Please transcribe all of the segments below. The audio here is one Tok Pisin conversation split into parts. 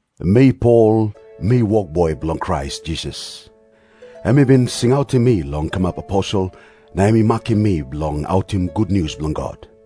Mi Pol, mi wokboi bilong Krais Jisas. Em i bin singautim mi long kamap aposel, na em i makim mi bilong autim gutnius bilong God.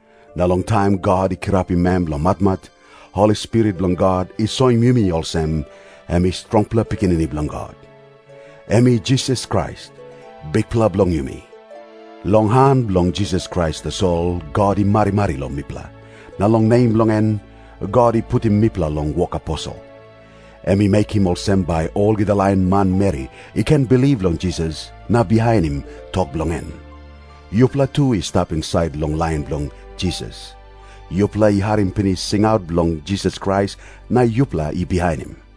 Na long taim God i kirapim em long matmat, Holi Spirit bilong God i soim yumi olsem, em i strongpela Pikinini Bilong God. Em i Jisas Krais, Bikpela bilong yumi. Long han bilong Jisas Krais tasol God i marimari long mipela, na long nem bilong en, God i putim mipela long wok aposel. Em i mekim olsem bai olgeta lain manmeri i ken bilip long Jisas na bihainim tok bilong en. Yupela tu i stap insait long lain bilong Jisas. Yupela i harim pinis singaut bilong Jisas Krais na yupela i bihainim.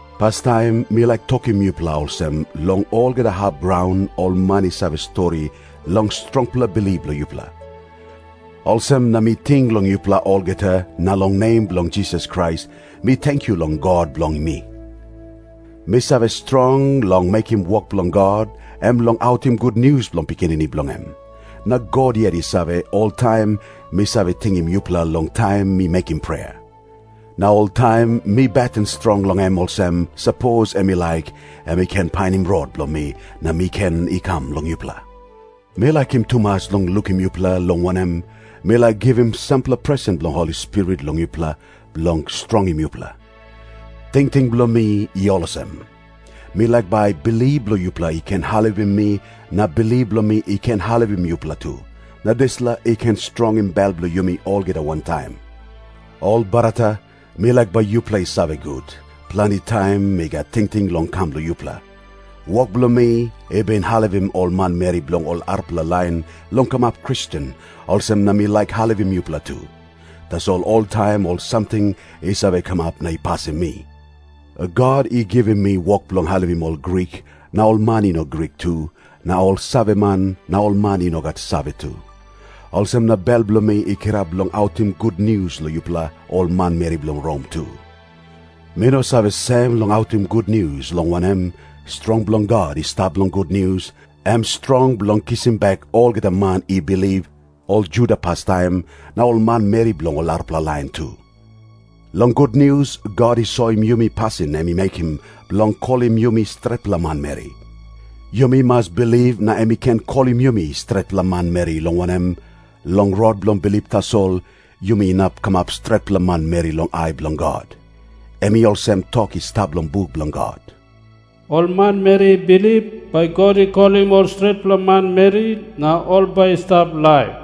Pastaim mi laik tokim yupela olsem, long olgeta hap graun ol man i save stori long strongpela bilip bilong yupela. Olsem na mi ting long yupela olgeta, na long nem bilong Jisas Krais mi tenkyu long God bilong mi. Mi save strong long mekim wok bilong God, em long autim gutnius bilong Pikinini bilong em. Na God yet i save, oltaim mi save tingim yupela long taim mi mekim prea. Na oltaim mi beten strong long em olsem, sapos em i laik, em i ken painim rot bilong mi na mi ken i kam long yupela. Mi laikim tumas long lukim yupela, long wanem, mi laik givim sampela presen bilong Holi Spirit long yupela bilong strongim yupela. Tingting bilong mi i olsem. Mi laik bai bilip bilong yupela i ken helpim mi na bilip bilong mi i ken helpim yupela tu, na dispela i ken strongim bel bilong yumi olgeta wantaim. Ol brata, mi laik bai yupela i save gut, planti taim mi gat tingting long kam long yupela. Wok bilong mi i bin helpim ol manmeri bilong ol arapela lain long kamap Kristen, olsem na mi laik helpim yupela tu. Tasol oltaim ol samting i save kamap na i pasim mi. God i givim mi wok bilong helpim ol Grik na ol man i no Grik tu, na ol saveman na ol man i no gat save tu. Olsem na bel bilong mi i kirap long autim gutnius long yupela ol manmeri bilong Rom tu. Mi no save sem long autim gutnius, long wanem, strong bilong God i stap long gutnius, em strong bilong kisim bek olgeta man i bilip, ol Juda pastaim, na ol manmeri bilong ol arapela lain tu. Long gutnius God i soim yumi pasin em i mekim bilong kolim yumi stretpela manmeri. Yumi mas bilip na em i ken kolim yumi stretpela manmeri, long wanem, long rot bilong bilip tasol yumi inap kamap stretpela manmeri long ai bilong God. Em i olsem tok i stap long buk bilong God, “Ol manmeri i bilip, bai God i kolim ol stretpela manmeri na ol bai i stap laip.”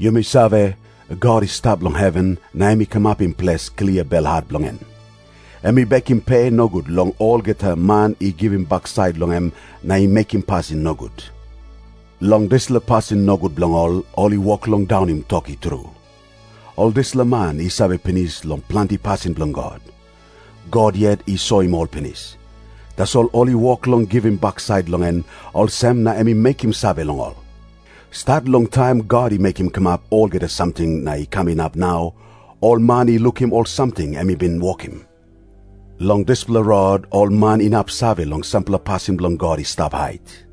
Yumi save, God i stap long heven na em i kamapim ples klia belhat bilong en. Em i bekim pe nogut long olgeta man i givim baksait long em na i mekim pasin nogut. Long dispela pasin nogut bilong ol, ol i wok long daunim tok i tru. Ol dispela man i save pinis long planti pasin bilong God. God yet i soim ol pinis. Tasol ol i wok long givim baksait long en, olsem na em i mekim save long ol. Stat long taim God i mekim kamap olgeta samting na i kam inap nau, ol man i lukim ol samting em i bin wokim. Long dispela rot ol man inap save long sampela pasin bilong God i stap hait.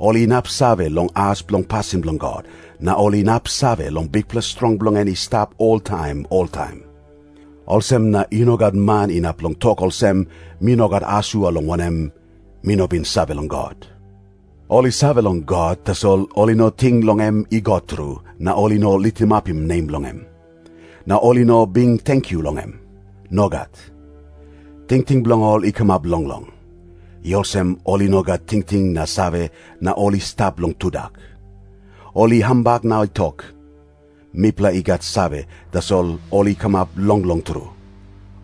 Ol inap save long as bilong pasin bilong God, na ol inap save long bikpela strong bilong en i stap oltaim oltaim. Olsem na i no gat man inap long tok olsem, “Mi no gat asua, long wanem, mi no bin save long God.” Ol i save long God, tasol ol i no ting long em i God tru, na ol i no litimapim nem bilong em. Na ol i no bin tenkyu long em. Nogat. Tingting bilong ol i kamap longlong. I olsem ol i no gat tingting na save, na ol i stap long tudak. Ol i hambak na i tok, “Mipela i gat save,” tasol ol i kamap longlong tru.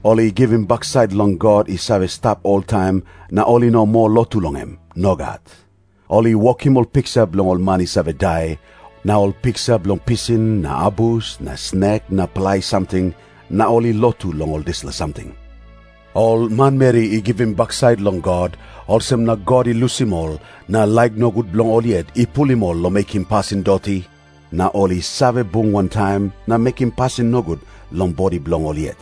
Ol i givim baksait long God i save stap oltaim, na ol i no moa lotu long em. Nogat. Ol i wokim ol piksa bilong ol man i save dai, na ol piksa bilong pisin na abus na snek na palai samting, na ol i lotu long ol dispela samting. Ol manmeri i givim baksait long God, olsem na God i lusim ol, na laik nogut bilong ol yet i pulim ol long mekim pasin doti, na ol i save bung wantaim na mekim pasin nogut long bodi bilong ol yet.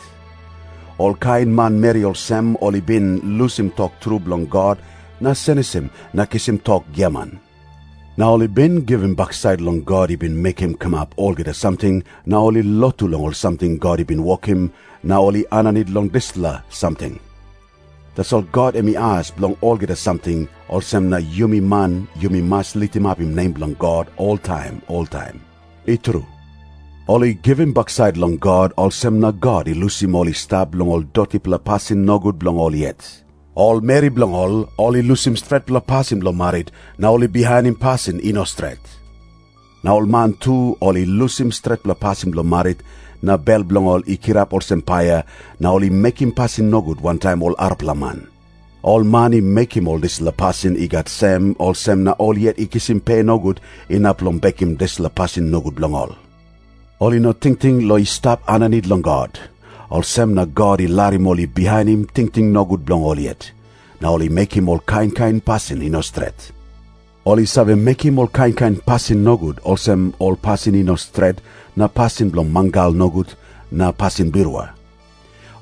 Olkain manmeri olsem ol i bin lusim tok tru bilong God na senisim na kisim tok giaman. Na ol i bin givim baksait long God i bin mekim kamap olgeta samting, na ol i lotu long ol samting God i bin wokim, na ol i aninit long ol dispela samting. Tasol God em i as bilong olgeta samting, olsem na yumi man yumi mas litimapim nem bilong God oltaim oltaim. I tru. Ol i givim baksait long God, olsem na God i lusim ol i stap long ol dotipela pasin nogut bilong ol yet. Ol meri bilong ol ol i lusim stretpela pasin bilong marit, na ol i bihainim pasin i no stret. Na ol man tu ol i lusim stretpela pasin bilong marit, na bel bilong ol i kirap olsem paia, na ol i mekim pasin nogut wantaim ol arapela man. Ol man i mekim ol dispela pasin i gat sem, olsem na ol yet i kisim pe nogut inap long bekim dispela pasin nogut bilong ol. Ol i no tingting long i stap aninit long God, olsem na God i larim ol i bihainim tingting nogut bilong ol yet. Na ol i mekim ol kain kain pasin i no stret. Ol i save mekim ol kain kain pasin nogut olsem, ol pasin i no stret na pasin bilong mangal nogut na pasin birua.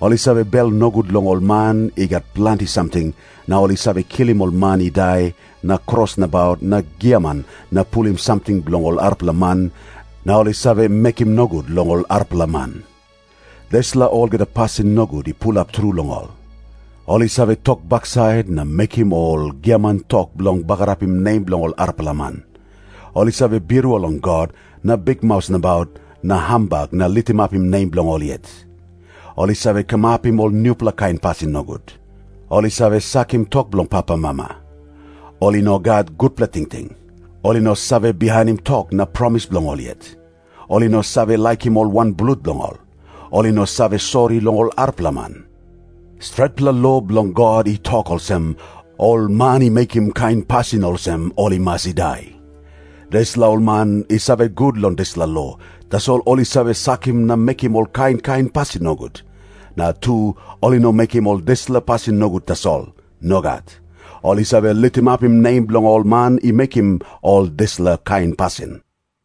Ol i save bel nogut long ol man i gat planti samting, na ol i save kilim ol man i dai na kros nabaut na giaman na pulim samting bilong ol arapela man, na ol i save mekim nogut long ol arapela man. Dispela olgeta pasin nogut i pulap tru long ol. Ol i save tok baksait na mekim ol giaman tok bilong bagarapim nem bilong ol arapela man. Ol i save birua long God na bikmaus nabaut na hambak na litimapim nem bilong ol yet. Ol i save kamapim ol nupela kain pasin nogut. Ol i save sakim tok bilong papamama. Ol i no gat gutpela tingting. Ol i no save bihainim tok na promis bilong ol yet. Ol i no save laikim ol wanblut bilong ol. Ol i no save sori long ol arapela man. Stretpela lo bilong God i tok olsem, “Ol man i mekim kain pasin olsem ol i mas i dai.” Dispela ol man i save gut long dispela lo, tasol ol i save sakim na mekim ol kain kain pasin nogut. Na tu, ol i no mekim ol dispela pasin nogut tasol. Nogat. Ol i save litimapim nem bilong ol man i mekim ol dispela kain pasin.